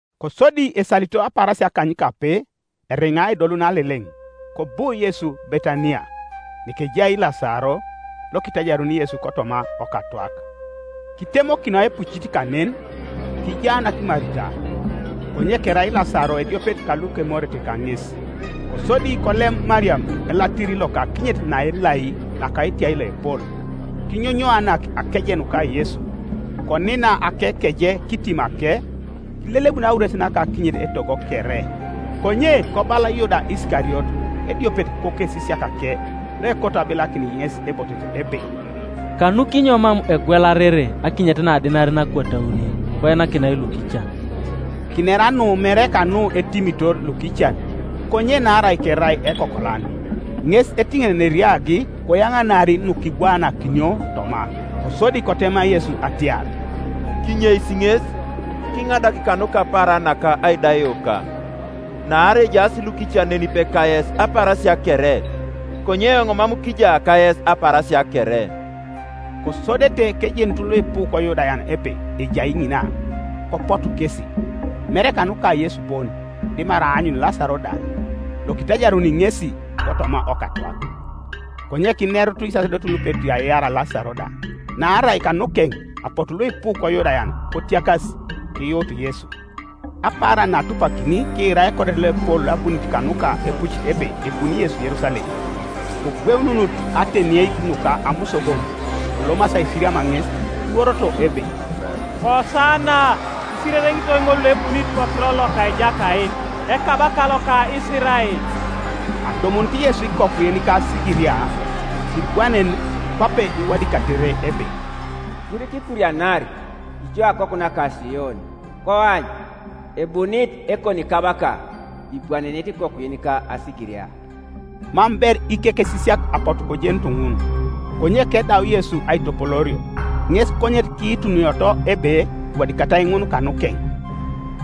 Kosodi esalito apaarasia akanykape eriŋa edoluno Aleleŋ, kobu Yesu Betaniya, nekejai Lasaro, lokitajaruni Yesu kotoma okatwak. Kitemokinoi epucit kanen; kijaanak Marita, konye kerai Lasaro ediopet kalukemorete kaŋes. Kosodi kolem Mariam elatiri loka akinyet naelai naka etiai loepol, kinyonyoanak akeje nuka Yesu, konina akekeje kitimake; kilelebun aures naka akinyet etogo kere, Konye kobala Yuda Isikariot, ediopet kokesisiakake, loekoto abilakin ŋes ebotet, ebe, “Kanukinyo mam egwelarere akinyet na adenarin akwat auni, koinakinai lukican?” Kinera nu mere kanu etimitor lukican; konye naarai kerai ekokolan, ŋes etiŋenenei eriagi koyaŋanar nukibwaanakinio toma. Kosodi kotema Yesu atiar, “Kinyeisi ŋes, kiŋadak kanuka apaaran naka aidaioka. Naarai ejaas lukican nenipe kayes apaarasia kere, konye eoŋ mam kija kayes apaarasia kere.” Kosodete kejenut luipu koYudayan ebe ejai ŋina; kopotu kesi, mere kanuka Yesu bon, dimarai aanyun Lasaro da, lokitajaruni ŋesi kotoma okatwak. Konye kinerut isasedotin lupeti aiar Lasaro da; naarai kanukeŋ apotu luipu koYudayan kotiakas, kiyuut Yesu. Apaaran naatupakini kiira ekodet loepol loabunit kanuka epucit ebe ebuni Yesu Yerusalem. Kogweununut atenieik nuka amusogon, kolomasi aisiriam ŋes, kiworoto ebe, “Kosana! Isirereŋitoi ŋol loebunit kokiror loka Ejakait, Ekabaka loka Isirael!” Adumunit Yesu ikoku yenika asigiria, kibwanen; kwape iwadikatere ebe, “Sirikikurianar, ijo akoku naka Sion; Koany ebunit Ekonikabaka, Ibwanenit ikoku yenika asigiria.” Mam ber ikekesisiak apotu kojenut ŋun: konye kedau Yesu aitopoloorio, ŋes konyet kiitunioto ebe iwadikatai ŋun kanukeŋ,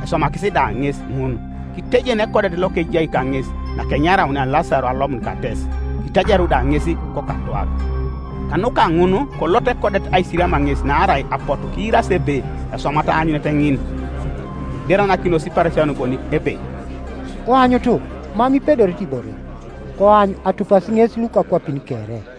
eswamakis da ŋes ŋun. Kitejen ekodet lokejai kaŋes nakenyaraunia Lasaro alomun kates, kitajaru da ŋes kokatwak. Kanuka ŋun kolot ekodet aisiriam ŋes naarai apotu kiirasi ebe eswamat aanyunet ŋin. Kineranakinos Iparisayon bonik ebe, “Koanyutu mam ipedorete ibore; koany, atupasi ŋes lukakwapin kere.”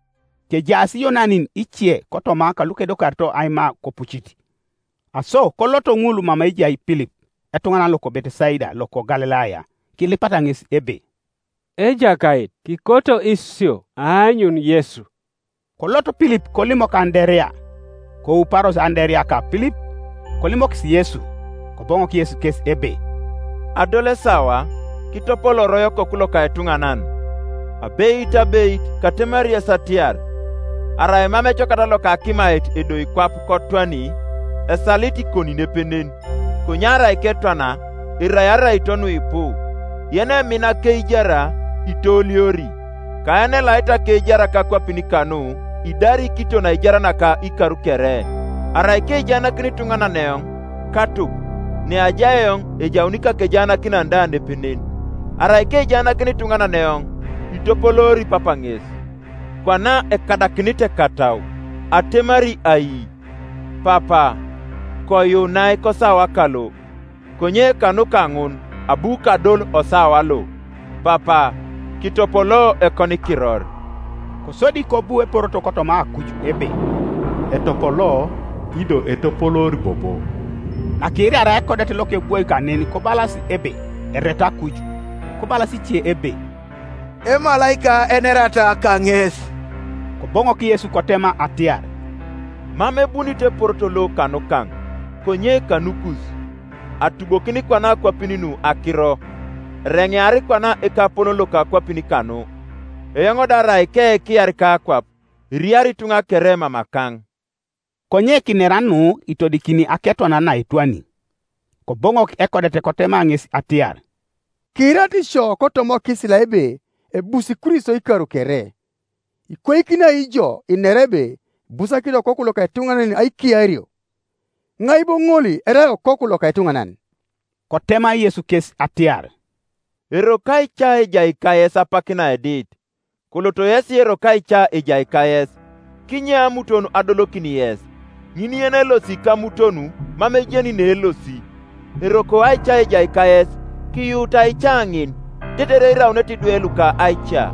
Kejaas Iyonanin ice kotoma kalukedokarito aima kopucit. Aso koloto ŋul mama ejai Pilip, etuŋanan loko Betesaida loko Galilaya, kilipata ŋes ebe, “Ejakait, kikoto isio aanyun Yesu.” Kolot Pilip kolimok Anderea; kouparos Anderea ka Pilip, kolimokis Yesu. Koboŋok Yesu kes ebe, “Adol esawa kitopolooroi Okoku loka etuŋanan. Abeit, abeit, katemari yes atiar, Arai mam ecokat loka akimait edoi kwap kotwani, esalit ikoni nepenen; konye arai ketwana, erai araito nuipu. Yenemina akeijar itooliori; ka yenelait akeijar kakwapin kanu idari kiton aijar naka ikar kere. Arai kejaanakini ituŋanan eoŋ, katup; neajai eoŋ ejauni ikakejaanakinan da nepenen; arai kejaanakini ituŋanan eoŋ, itopoloori Papa ŋes. “Kwana ekadakinit ekatau; atemari ai? Papa, koyuunai kosawa kalo. Konye kanuka ŋun abu kadol osawa lo. Papa, kitopoloo ekonikiror.” Kosodi kobu eporoto kotoma akuj ebe, “Etopolo, ido etopoloori bobo.” Nakiiraria ekodet lokebwoi kanen kobalas ebe Eretu akuj; kobalas ice ebe, “Emalaika enerata kaŋes.” Koboŋok Yesu kotema atiar, “Mam ebunit eporoto lo kanukaŋ, konye kanukus. Atubokin kwana akwapin nu akiro: ereŋear kwana ekapolon loka akwapin kanu. Eoŋ da arai keekiar kakwap, eriari ituŋa kere mamakaŋ.” Konye kinera nu itodikini aketwanare naetwani. Koboŋok ekodet kotema ŋes atiar, “Kiirarit isio kotoma okisila ebe ebusi Kristo ikar kere: ikwaikini ai ijo inera ebe ibusakinit Okoku loka etuŋanan aikiario? Iŋai bo ŋol erai Okoku loka etuŋanan?” Kotema Yesu kes atiar, “Eroko aica ejai kayes apak naedit. Koloto yesi eroko aica ejai kayes, kinye amuton adolokin yes; ŋin yenelosi kamuton mam ejeni neelosi. Eroko aica ejai kayes, kiyuutu aica ŋin, tetere iraunete idwe luka aica.”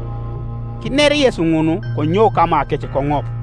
Kiner Yesu ŋun, konyou kamakec koŋop.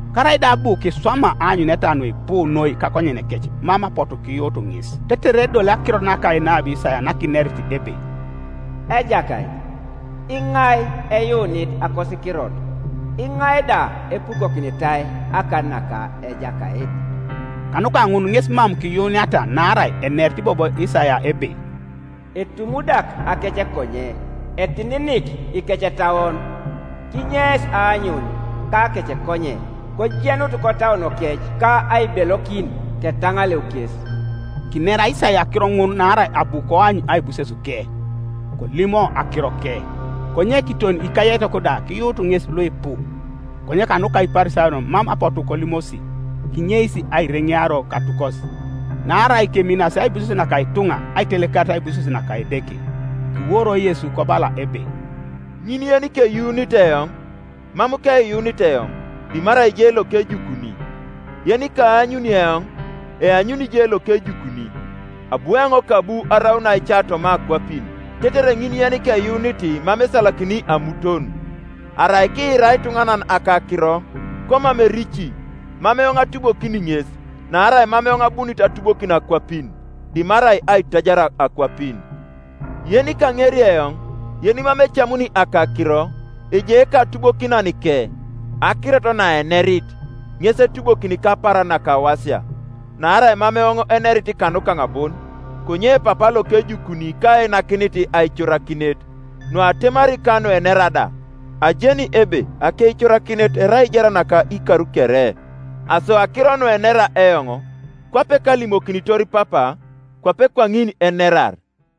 Karaida abu kiswama aanyuneta nuipu noi kakonyenekec mam apotu kiyuut ŋes; tetere edoli akirot naka enabi Isaia nakinerit ebe, “Ejakait, iŋai eyuunit akosikirot? Iŋai da epukokinitai akan naka Ejakait?” Kanuka ŋun ŋes mam kiyuuniata naarai enerit bobo Isaia ebe, “Etumudak akecekonye, etininik ikecetauon, Kinyeis aanyun kakecekonye, kojenut kotauonokec, Ka aibelokin, ketaŋaleu kes.” Kinera Isaia akiro ŋun naarai abu koany aibusesuke, kolimo akiroke. Konye kiton ikayaitok da kiyuut ŋes luipu; konye kanuka Iparisayon mam apotu kolimosi, kinyeis aireŋeario katukos: naarai keminasi aibuses naka ituŋa aitelekarit aibuses naka Edeke. Kiworo Yesu kobala ebe, “Ŋin yenikeyuunit eoŋ, mam keyuunit eoŋ, dimarai je lokejukuni. Yenikaanyuni eoŋ, eanyuni je lokejukuni. Abu eoŋ kabu araun aica toma akwapin, tetere ŋin yenikeyuunit mam esalakini amuton. Arai kiira ituŋanan akakiro, komam erici, mam eoŋ atubokini ŋes; naarai mam eoŋ abunit atubokin akwapin, dimarai aitajar akwapin. Yenikaŋeri eoŋ, yenimam ecamuni akakiro, ejai ekatubokinanike: akirot naenerit, ŋes etubokini kapaaran nakawasia. Naarai mam eoŋ enerit kanukaŋ bon; konye Papa lokejukuni kainakinit aicorakinet, nuatemari ka nuenera da. Ajeni ebe akeicorakinet erai aijar naka ikar kere: aso akiro nuenera eoŋ, kwape kalimokinitor Papa, kwape kwaŋin enerar.”